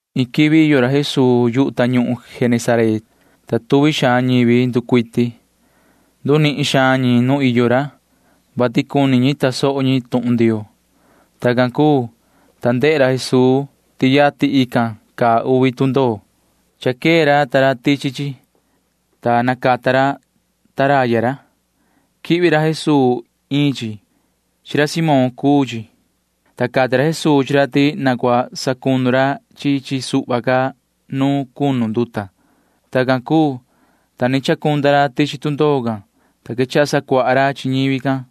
Iin quivi iyo ra Jesuu yu tañuhun Genesaret, ta tuvi xaan ñivi nducuiti. Ndunihin xaan ñi nu iyo ra, vati cuni ñi tasoho ñi tuhun Ndioo. Tacan cuu, ta ndehe ra Jesuu ti yatin caa uvi tundoo. Cha quee ra ta ra tichi chi, ta nacata ra taraya ra. Quihvi ra Jesuu iin chi. Chi ra Simón cuu chi, ta cati ra Jesuu chi ra ti na cua sacunu ra chi chi suhva ca nu cunu nduta. Tacan cuu, ta ni chacunda ra tichi tundoo can, ta quechaha sacuaha ra chi ñivi can.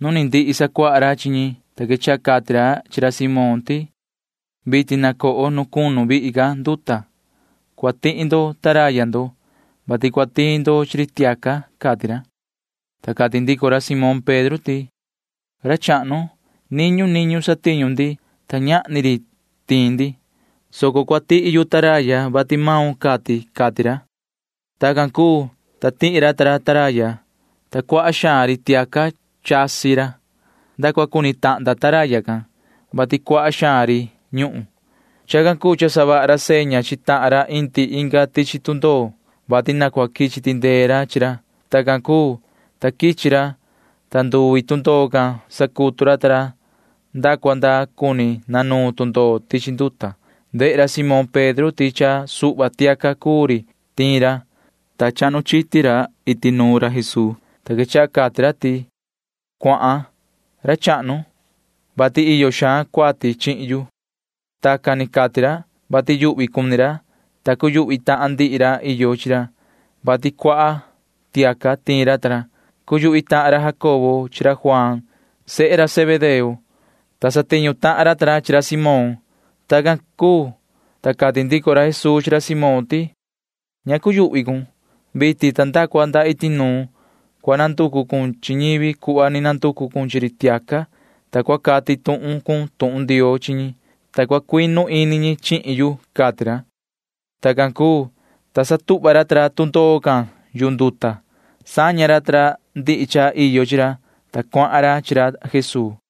Nu ni ndihi sacuaha ra chi ñi, ta quechaha cati ra chi ra Simón ti: ―Vitin na coho nu cunu xaan nduta. Cua tihi ndo taraya ndo, vati cua tiin ndo chi ri tiaca ―cati ra. Ta cati ndico ra Simón Pedro ti: ―Ra chahnu, niñu niñu satiñu ndi, ta ñahni ri tiin ndi, soco cua tihi yu taraya, vati maun cati ―cati ra. Tacan cuu, ta tihi ra ta ra taraya, ta cuaha xaan ri tiaca chasi ra. Nda cua cuni tahnda taraya can, vati cuaha xaan ri ñuhun. Chacan cuu cha savaha ra seña chi tahan ra iyo inga tundoo, vati cua quichi tindee ra chi ra. Tacan cuu, ta quichi ra, ta nduvi tundoo can sacutu ra ta ra nda cua cuni nanuun tundoo tichi nduta. Ndehe ra Simón Pedro can ti cha suhva tiaca cuu ri tiin ra, ta chahnu chiti ra iti nuun ra Jesuu, ta quechaha cati ra ti: ―Cuahan, ra chahnu, vati iyo xaan cuati chihin yu. Tacan ni cati ra, vati yuhvi xaan ra cuu, ta cuyuhvi tahan ndihi ra iyo chi ra, vati cuaha suhva tiaca tiin ra ta ra. Cuyuhvi tahan ra Jacobo chi ra Juaan. Sehe Zebedeo chi ra ta ra, ta satiñu tahan ra ta ra chi ra Simón. Tacan cuu, ta cati ndico ra Jesuu chi ra Simón ti: ―Ña cuyuhvi cun. Nda vitin ta nda cua nda iti nuun cua nanducu cun chi ñivi cuhva ni nanducu cun chi ri tiaca, [ta cua cati tuhun cun tuhun Ndioo chi ñi, ta cua cuinu ini ñi chihin yu] ―cati ra. Tacan cuu, ta satuhva ra ta ra tundoo can yu nduta. Saña ra ta ra ndihi cha iyo chi ra, ta cuahan ra chi ra Jesuu.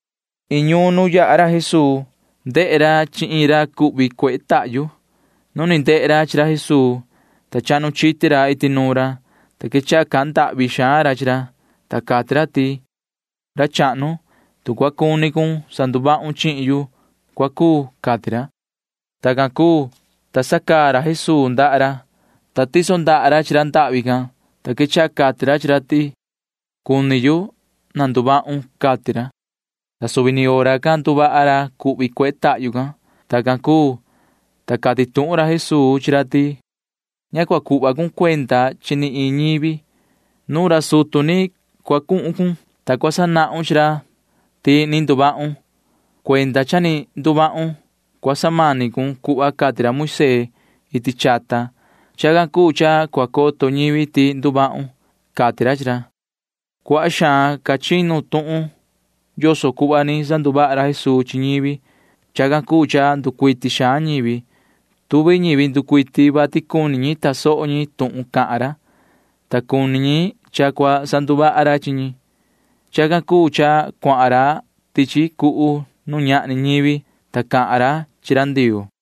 Iin ñuun nu yaha ra Jesuu, ta tahan ra iin ra cuhvi, ta cuehe tahyu cuhvi xaan ra. Nu ni ndehe ra chi ra Jesuu, ta chahnu chiti ra iti nuun ra, ta quechaha cahan ndahvi xaan ra chi ra, ta cati ra ti: ―Ra chahnu, tu cua cuni cun sanduvahun chihin yu, cua cuu ―cati ra. Tacan cuu, ta sacaa ra Jesuu ndaha ra, ta tiso ra ndaha ra chi ra ndahvi can, ta quechaha cati ra chi ra ti: ―Cuni yu. Na nduvahun ―cati ra. Ta suvi ni hora can nduvaha ra cuhvi cuehe tahyu can. Tacan cuu, ta cati tuhun ra Jesuu chi ra ti: ―Ña cua cuhva cun cuenda chi ni iin ñivi. Nuun ra sutu ni cua cuhun cun, ta cua sanahun chi ra ti ni nduvahun. Cuenda cha ni nduvahun cua cuiso cun cuhva cati ra Moisee iti chata. Chacan cuu cha cua coto ñivi ti ni nduvahun ―cati ra chi ra. Cuaha xaan ca chinu tuhun yoso cuhva ni sanduvaha ra Jesuu chi ñivi. Chacan cuu cha nducuiti xaan ñivi. Tuvi ñivi nducuiti, vati cuni ñi tasoho ñi tuhun cahan ra, ta cuni ñi cha cua sanduvaha ca ra chi ñi. Chacan cuu cha cuahan ra tichi cuhu nu ñahni ñivi, ta cahan ra chi ra Ndioo.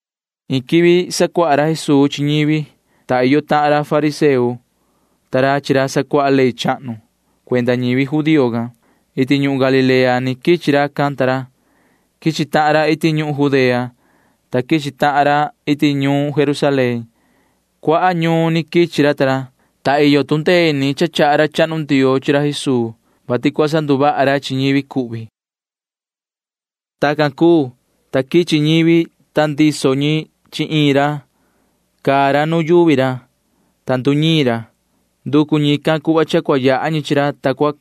Iin quivi sacuaha ra Jesuu chi ñivi, ta iyo tahan ra fariseo ta ra chi ra sacuaha ley chahnu cuenda ñivi judío can. Iti ñuhun Galilea ni quichi racan ta ra. Quichi tahan ra iti ñuhun Judea, ta quichi tahan ra iti ñuun Jerusalén. Cuaha ñuun ni quichi ra ta ra, ta iyo tu ndee ini cha chaha ra chahnu Ndioo chi ra Jesuu, vati cua sanduvaha ra chi ñivi cuhvi. Tacan cuu, ta quichi ñivi, ta ndiso ñi chi iin ra. Caa ra nu yuvi ra, ta nduñiin ra. Nducu ñican cuhva cha cua yaha ñi chi ra, ta cua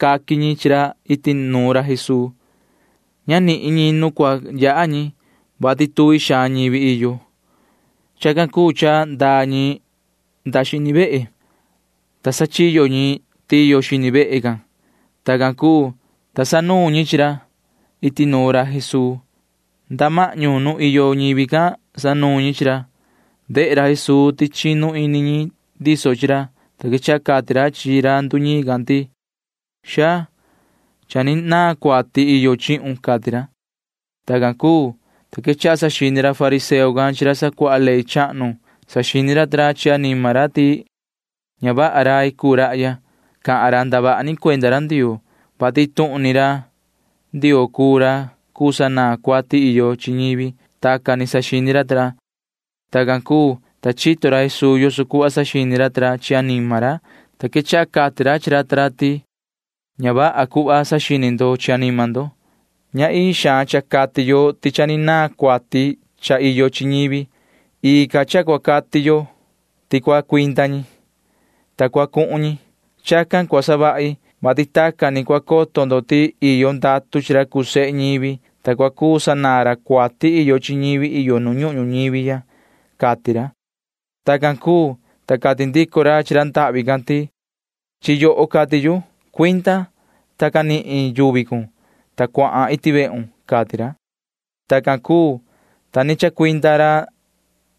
caqui ñi chi ra iti nuun ra Jesuu. Ña nihin ñi nu cua yaha ñi, vati tuvi xaan ñivi iyo. Chacan cuu cha ndaa ñi nda xini vehe, ta sachiyo ñi tiyo xini vehe can. Tacan cuu, ta sanuun ñi chi ra. Iti nuun ra Jesuu nda mahñu nu iyo ñivi can sanuun ñi chi ra, ta caa ra. Ndehe ra Jesuu ti chinu ini ñi ndiso chi ra, ta quechaha cati ra chi ra nduñiin can ti: ―Xaa, cha ni naan cuati iyo chihun ―cati ra. Tacan cuu, ta quechaha saxini ra fariseo can chi ra sacuaha ley chahnu. Saxini ra ta ra chi anima ra ti ña vaha rai cuu rahya. Cahan ra ndavaha ni cuenda ra Ndioo, vati iin tuhun ni ra Ndioo cuu ra cuu sanaan cuati iyo chi ñivi. Tacan ni saxini ra ta ra. Tacan cuu, ta chito ra Jesuu yoso cuhva saxini ra ta ra chi anima ra, ta quechaha cati ra chi ra ta ra ti: ―Ña vaha cuhva saxini ndo chi anima ndo. Ña ii xaan cha cati yo ti cha ni naan cuati cha iyo chi ñivi. Ii ca cha cua cati yo ti cua cuinda ñi, ta cua cuhun ñi. Chacan cua savahi, vati tacan ni cua coto ndo ti iyo ndatu chi ra cuu sehe ñivi, ta cua cuu sanaan ra cuati iyo chi ñivi iyo nu ñuhun ñuñivi ya ―cati ra. Tacan cuu, ta cati ndico ra chi ra ndahvi can ti: ―Chi yoho cahan yu. Cuinda, ta canihun yuvi cun, ta cuahan iti vehun ―cati ra. Tacan cuu, ta ni chacuinda ra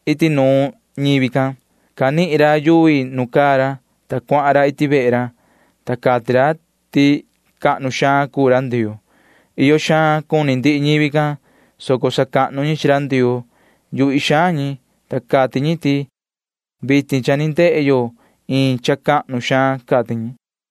iti nuun ñivi can. Canihin ra yuvi nu caa ra, ta cuahan ra iti vehe ra, ta cati ra ti cahnu xaan cuu ra Ndioo. Iyo xaan cuni ndihi ñivi can, soco sacahnu ñi chi ra Ndioo. Yuhvi xaan ñi, ta cati ñi ti: ―Vitin cha ni ndehe yo iin cha cahnu xaan ―cati ñi.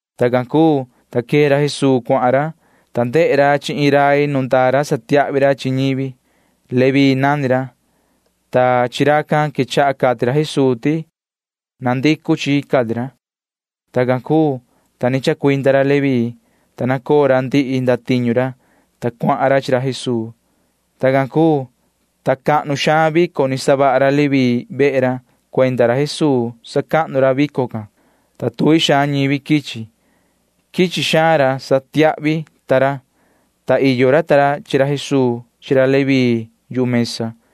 Tacan cuu, ta quee ra Jesuu cuahan ra, ta ndehe ra chi iin rai nu ndaa ra satiahvi ra chi ñivi. Leví nani ra, ta chi racan quechaha cati ra Jesuu ti: ―Na coho ―cati ra. Tacan cuu, ta ni chacuinda ra Leví can, ta nacoo ra ndihi ndatiñu ra, ta cuahan ra chi ra Jesuu. Tacan cuu, ta cahnu xaan vico ni savaha ra Leví vehe ra. Cuenda ra Jesuu sacahnu ra vico can, ta tuvi xaan ñivi quichi. Quichi xaan ra satiahvi ta ra, ta iyo ra chi ra Jesuu chi ra Leví yu mesa.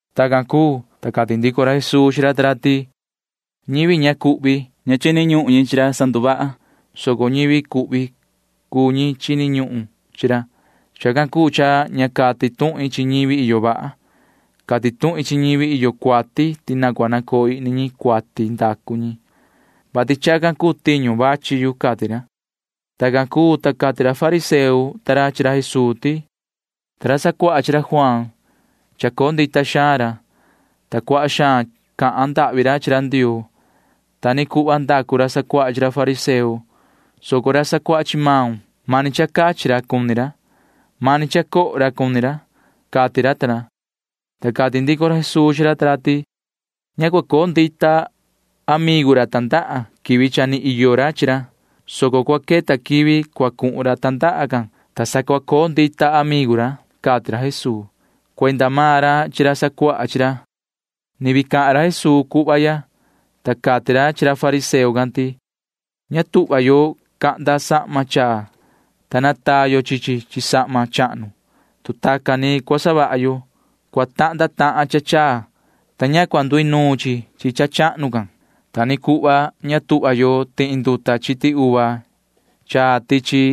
Tacan cuu, ta cati ndico ra Jesuu chi ra ta ra ti: ―Ñivi ña cuhvi―ña chini ñuhun ñi chi ra sanduvaha, soco ñivi cuhvi cuu ñi chini ñuhun chi ra. Chacan cuu cha ña cati tuhin chi ñivi iyo vaha. Cati tuhin chi ñivi iyo cuati ti na cua nacoo ihni ñi cuati ndacu ñi, vati chacan tiñu vachi yu ―cati ra. Tacan cuu, ta cati ra fariseo ta ra chi ra Jesuu ti: ―Ta ra sacuaha chi ra Juaan―chacoo ndita xaan ra, ta cuaha xaan cahan ndahvi ra chi ra Ndioo. Ta ni cuhva ndacu ra sacuaha chi ra fariseo, soco ra sacuaha chi maun―mani cha cachi ra cuni ra. Mani cha coho ra cuni ra ―cati ra ta ra. Ta cati ndico ra Jesuu chi ra ta ra ti: ―Ña cua coo ndita amigu ra tandaha quivi ni iyo ra chi ra, soco cua queta quivi cua cuhun ra tandaha can, ta sa cua coo ndita amigu ra ―cati ra Jesuu [cuenda maan ra chi ra sacuaha chi ra]. Ni vii cahan ra Jesuu cuhva ya, ta cati ra chi ra fariseo can ti: ―Ña tuhva yo cahnda yo sahma chaa, ta nataa yo chi chi chi sahma chahnu. Tu tacan ni cua savaha yo, cua tahnda tahan cha chaa, ta ña cua nduinuun chi chi cha chahnu can. Ta ni cuhva ña tuhva yo tihi yo nduta chiti uva chaa tichi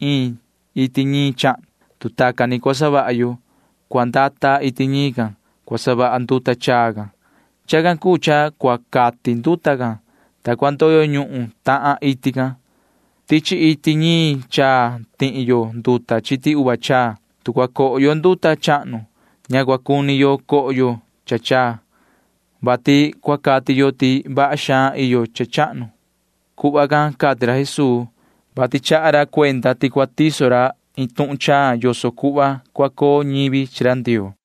iin iti ñiin chahnu. Tu tacan ni cua savaha yo, cua ndata iti ñiin can cua savaha nduta chaa can. Chacan cuu cha cua cati nduta can, ta cua ndoyo ñuhun tahan iti can. Tichi iti ñiin chaa tihi yo nduta chiti uva chaa. Tu cua coho yo nduta chahnu, ña cua cuni ca yo cha chaa, vati cua cati yo ti vaha xaan iyo cha chahnu. [Cuhva can cati ra Jesuu, vati chaha ra cuenda ti cua tiso ra iin tuhun chaa yoso cuhva cua coo ñivi chi ra Ndioo.]